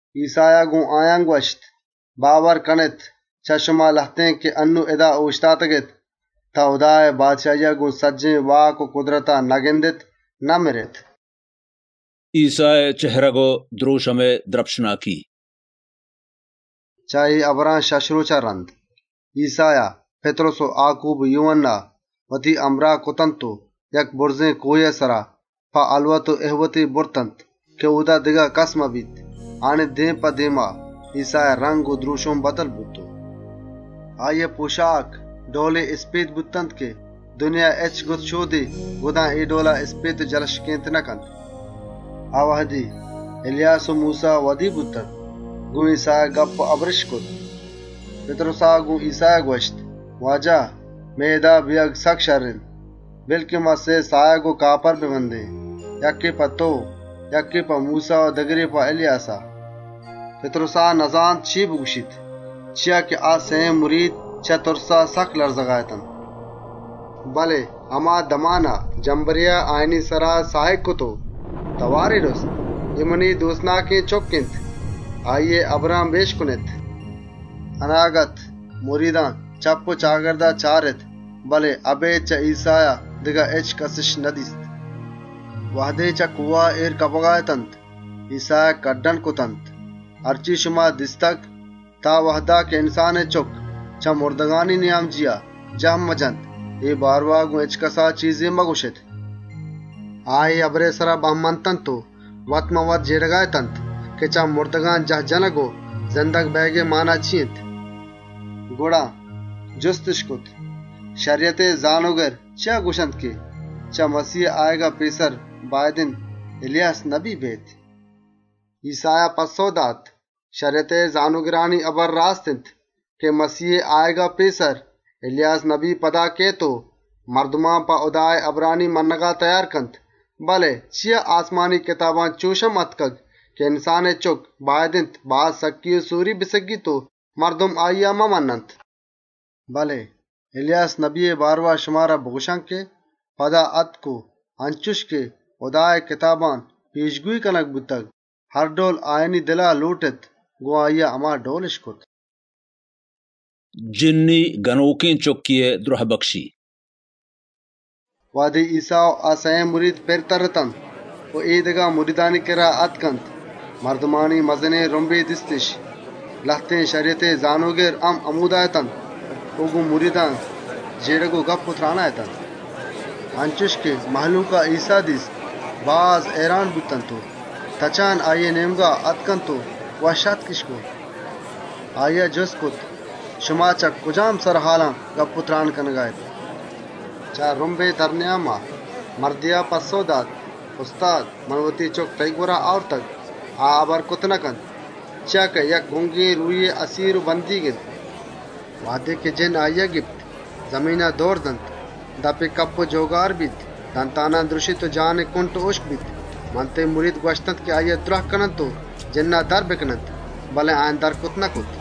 ‏ ایسّایا گۆن آیان گوَشت: «باور کنێت، چه شما لهتێن که انّون اِدا اۆشتاتگ، تان هُدائے بادشاهیا گۆن سجّهێن واک و کُدرتا نگندیت، مَرکئے تاما نچَشیت.» ایسّائے دێم و دْرۆشمئے دْرپشناکی ‏ چه اے هبران شَش رۆچا رَند، ایسّایا پِتْرُس و آکوب و یوهَنّا وتی همراه کرت و یک بُرزێن کۆهێئے سرا په هَلوت و اِهوتے برتنت که اۆدا دگه کَسّ مبیت. آیانی دێما، ایسّائے رَنگ و دْرۆشم بدل بوت و ‏ آییئے پۆشاک، انچُش اِسپێت بوتنت که جهانئے هچ گُدشۆدے گُدان اے ڈئولا اِسپێت و جلشکۆک کرتَ نکنت. ‏ آ وهدی، اِلیاس و موسّا زاهر بوتنت و گۆن ایسّایا گپّ و هبرِش کرت. ‏ پِتْرُسا گۆن ایسّایا گوَشت: «واجه! مئے اِدا بئیگ سکّ شَرّ اِنت، بِلّ که ما سئے ساهگ و کاپارَ بندێن، یکّے په تئو، یکّے په موسّا و دگرے په اِلیاسا.» ‏ پِتْرُسا نزانت چے بگوَشیت، چیا که چه تُرسا سکّ لَرزگا اتنت، ‏ بله هما دمانا جمبرێا آیانی سرا ساهگ کرت و تئوارے رُست: «اے منی دۆستێن بَچّ اِنت، اِشیئے هبران گۆش بدارێت!» ‏ اَناگت، مریدان چپّ و چاگردا چارت، بله اَبێد چه ایسّایا دگه هچکَسِش ندیست. ‏ چه کۆها اێر کپگئے وهدا، ایسّایا هُکم کرتنت: «تان آ وهدا که انسانئے چُکّا چه مُردگان جاه نجتگ، وتی اے دیستگێنانی بارئوا هچکَسا هال مدئیێت.» ‏ آ، اے هبرئے سرا بَه مَنت و وت‌مان‌وت جێڑگا اتنت که چه مُردگان جاه جنَگ و زندگ بئیگئے مانا چی اِنت؟ ‏ گڑا جُستِش کرت: «شَریَتئے زانۆگر چیا گوَشنت که چه مَسیهئے آیگا پێسر، باید اِنت اِلیاس نبی بیئیت؟» ‏ ایسّایا پَسّئو دات: «شَریَتئے زانۆگرانی هبر راست اِنت که مَسیهئے آیگا پێسر، اِلیاس نبی پدا کئیت و سجّهێن کاران گوَم و گێگَ کنت. بله آسمانی کتابان په چے چُش آتکگ که انسانئے چُکّ باید اِنت باز سکّی و سۆری بسگّیت و مردم آییا ممَنّنت؟ ‏ اِلیاس نبیئے بارئوا شمارا بگوَشان که آ پدا آتک و انچُش که هُدائے کتابان پێشگۆیی کنگ بوتگ، هر ڈئول آیانی دلا لۆٹت، گۆن آییا هما ڈئولِش کرت.» جِنّی بچکێئے دْرهبکشی ‏ وهدے ایسّا و سئیێن مرید پِر ترّت و اے دگه مریدانی کِرّا آتکنت، مردمانی مزنێن رُمبے دیستِش. لهتێن شَریَتئے زانۆگر هم همۆدا اَت و گۆن مریدان، جێڑگ و گپّ و ترانا اَت. ‏ انچُش که مهلوکا ایسّا دیست، باز هئیران بوتنت و تچانا آییئے نێمگا آتکنت و وشّ‌آتکِش کرت. ‏ آییا جُست کرت: «شما چه کجام سرهالان گپّ و تْران کنگا اێت؟» ‏ چه رُمبئے نیاما، مردێا پَسّئو دات: «استاد! من وتی بچک تئیی گوَرا آورتگ. آ هبر کرتَ نکنت، چیا که یک گُنگێن روهێئے اَسیر و بندیگ اِنت. ‏ وهدے جِنّ آییا گیپت، زمینا دئوریَ دنت، دپی کَپ و گَجَّ بیت، دنتانَ دْرُشیت و کُنٹ و هُشکَ بیت. من تئیی مرید گوَشتنت که آییا دْراه کننت و جِنّا در بکننت، بله آیان کَشّت نکرت.» ‏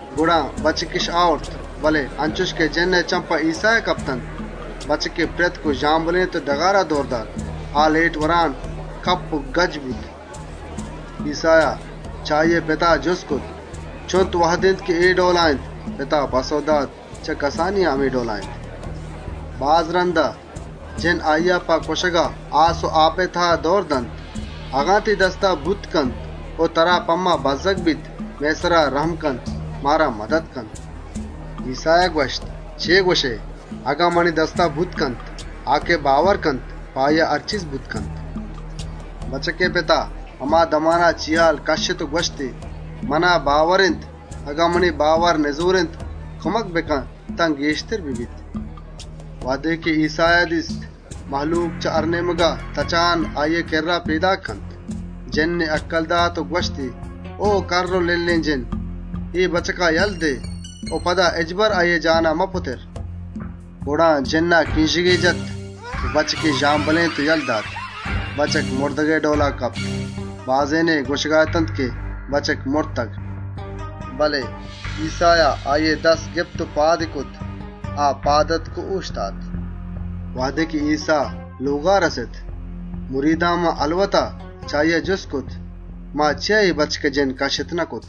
گڑا بچکِش آورت، بله انچُش که جِنّئے چمّ په ایسّایا کپتنت، بچکی پْرِتک و ژامبلێنت و ڈگارا دئور دات. آ، لێٹ وران کَپ و گَجّ بوت. ‏ ایسّایا چه آییئے پتا جُست کرت: «چُنت وهد اِنت که اے ڈئولا اِنت؟» پتا پَسّئو دات: «چه کسانیا همے ڈئولا اِنت. ‏ باز رَندا، جِنّ آییا په کُشگا آس و آپا دئورَ دنت. اگن تئیی دستا بوتَ کنت، ما بَزّگ اێن، مَدَت کن.» ‏ ایسّایا گوَشت: «چے گوَشئے؟ اگن منی دستا بوتَ کنت؟ آ که باورَ کنت، په آییا هر چیز بوتَ کنت.» ‏ بچکئے پتا هما دمانا کوکّار کرت و گوَشتی: «منا باور اِنت، اگن منی باور نِزۆر اِنت، کُمک بکن تان پُرزۆرتر ببیت.» ‏ وهدے ایسّایا دیست مهلوک چه هر نێمگا تچان آییئے کِرّا پێداک اِنت، جِنّی هَکَّل دات و گوَشتی: «او کَرّ و لِلّێن جِنّ! اے بچکا یله دئے و پدا هچبر اِشیئے جسم و جانا مپُتر.» ‏ گڑا جِنّا کرینژگے جت و بچکی ژامبلێنت و یله دات. بچک مُردگئے ڈئولا کپت. بازێنے گوَشگا اَت که بچک مرتگ. ‏ بله ایسّایا آییئے دست گپت و پادی کرت. آ پاد آتک و اۆشتات. ‏ وهدے ایسّا لۆگا رَست، مریدان هَلوتا چه آییا جُست کرت: «ما چیا اے بچکئے جِنّ کَشّت نکرت؟» ‏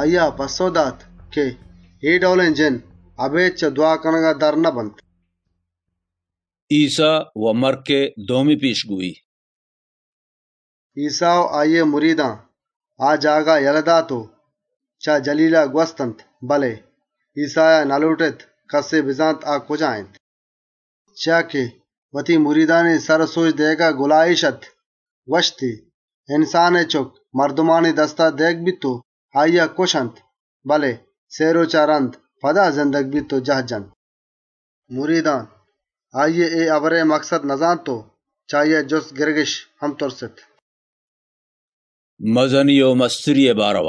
آییا پَسّئو دات: «اے ڈئولێن جِنّ، اَبێد چه دْوا کنگا درَ نبنت.» ایسّائے مَرکئے دومی پێشگۆیی ‏ ایسّا و آییئے مریدان آ جاگه یله دات و چه جَلیلا گوَستنت، بله ایسّایا نلۆٹت کَسے بزانت آ کجا اِنت، ‏ چیا که وتی مریدانی سر و سۆج دئیگا گُلاێش اَت. گوَشتی: «انسانئے چُکّ درۆهگَ بیت و انچێن مردمانی دستا دئیگَ بیت که کُشنتی، بله سئے رۆچا رَند، پدا زندگَ بیت و جاهَ جنت.» ‏ بله مرید آییئے اے هبرا سرپد نبوتنت و چه آییا جُست کنگِش هم تُرست. مزنی چی اِنت؟ ‏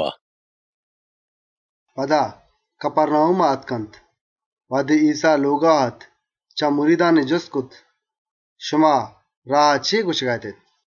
پدا کَپَرناهوما آتکنت. وهدے ایسّا لۆگا اَت، چه مریدان جُستی کرت: «شما راها چے گوَشگا اتێت؟» ‏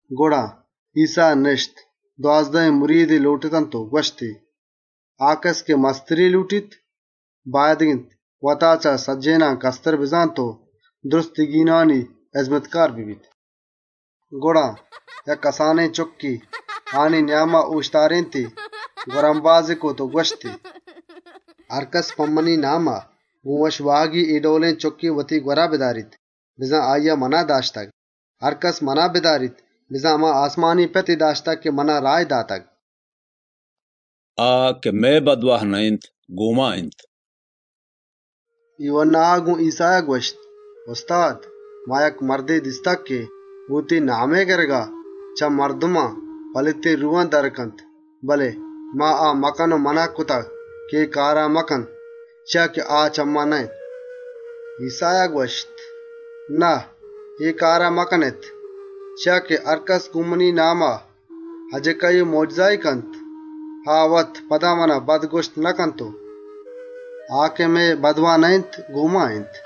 گڑا ایسّا نِشت، دوازدهێن مریدی لۆٹتنت و گوَشتی: «آ کَس که مستریَ لۆٹیت، باید اِنت وتا چه سجّهێنان کَستر بزانت و سجّهێنانی هِزمتکار ببیت.» ‏ گڑا، یک کسانێن چُکّے آیانی نیاما اۆشتارێنتی، بَڈّا کرت و گوَشتی: ‏ «هرکَس په منی ناما، گۆن وشواهگی اے ڈئولێن چُکّے وتی گوَرا بداریت، بزان آییا منا داشتگ. هرکَس منا بداریت، بزان هما آسمانی پتی داشتگ که منا راهی داتگ.» آ که مئے بَدواه نه‌اِنت، گۆن ما اِنت ‏ یوهَنّایا گۆن ایسّایا گوَشت: «استاد! ما یک مردے دیست که گۆن تئیی نامئے گِرگا، چه مردمان پلیتێن روهان درَ کنت، بله ما آ مَکَن و مَنَه کرت، چیا که آ مرد چه ما نه‌اَت.» ‏ ایسّایا گوَشت: «نه، اے کارا مکنێت، چیا که هرکَس گۆن منی ناما مۆجزه و اَجِکّاییے کنت، آ وت پدا منا بد گوَشتَ نکنت و ‏ آ که مئے بَدواه نه‌اِنت گۆن ما اِنت. ‏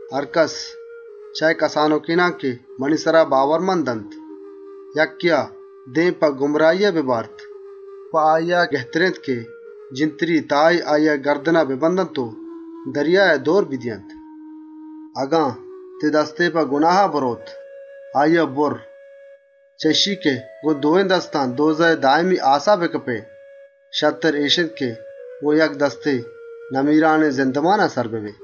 «هرکَس، چه اے کسانُکێنان که منی سرا باورمند اَنت یکّێا دێم په گناها ببارت، په آییا گهتر اِنت که جِنتری تایے آییئے گردنا ببندنت و دریایا چَگلی بدئینت. ‏ اگن تئیی دستے ترا دێم په گناها ببارت، آییا بُرّ. چیا که گۆن دوێن دستان تَهتَرونئے دایمی آسا کپگئے بدلا، شرتر همِش اِنت که گۆن یک دستے، نمیرانێن زِندئے واهند ببئے. ‏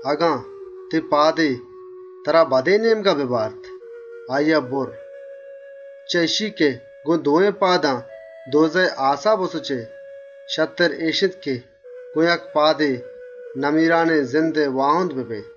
اگن تئیی پادے ترا دێم په گناها ببارت، آییا بُرّ. چیا که گۆن دوێن پادان تَهتَرونا کپگئے بدلا، شرتر همِش اِنت که گۆن یک پادے نمیرانێن زِندئے واهند ببئے. ‏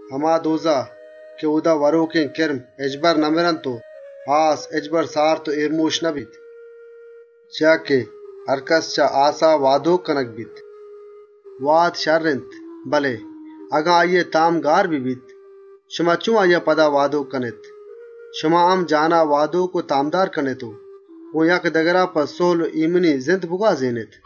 هما تَهتَرون، که اۆدا وَرۆکێن کِرم هچبرَ نمرنت و آس هچبر سارت و اێرمۆشَ نبیت. ‏ چیا که هرکَس چه آسا وادۆک کنگَ بیت. ‏ واد شَرّ اِنت، بله اگن آییئے تام گار ببیت، شما چۆن آییا پدا وادۆکَ کنێت. شما هم وتا وادۆک و تامدار کنێت و گۆن یکدگرا په سُهل و اێمنی زِند بگوازێنێت.»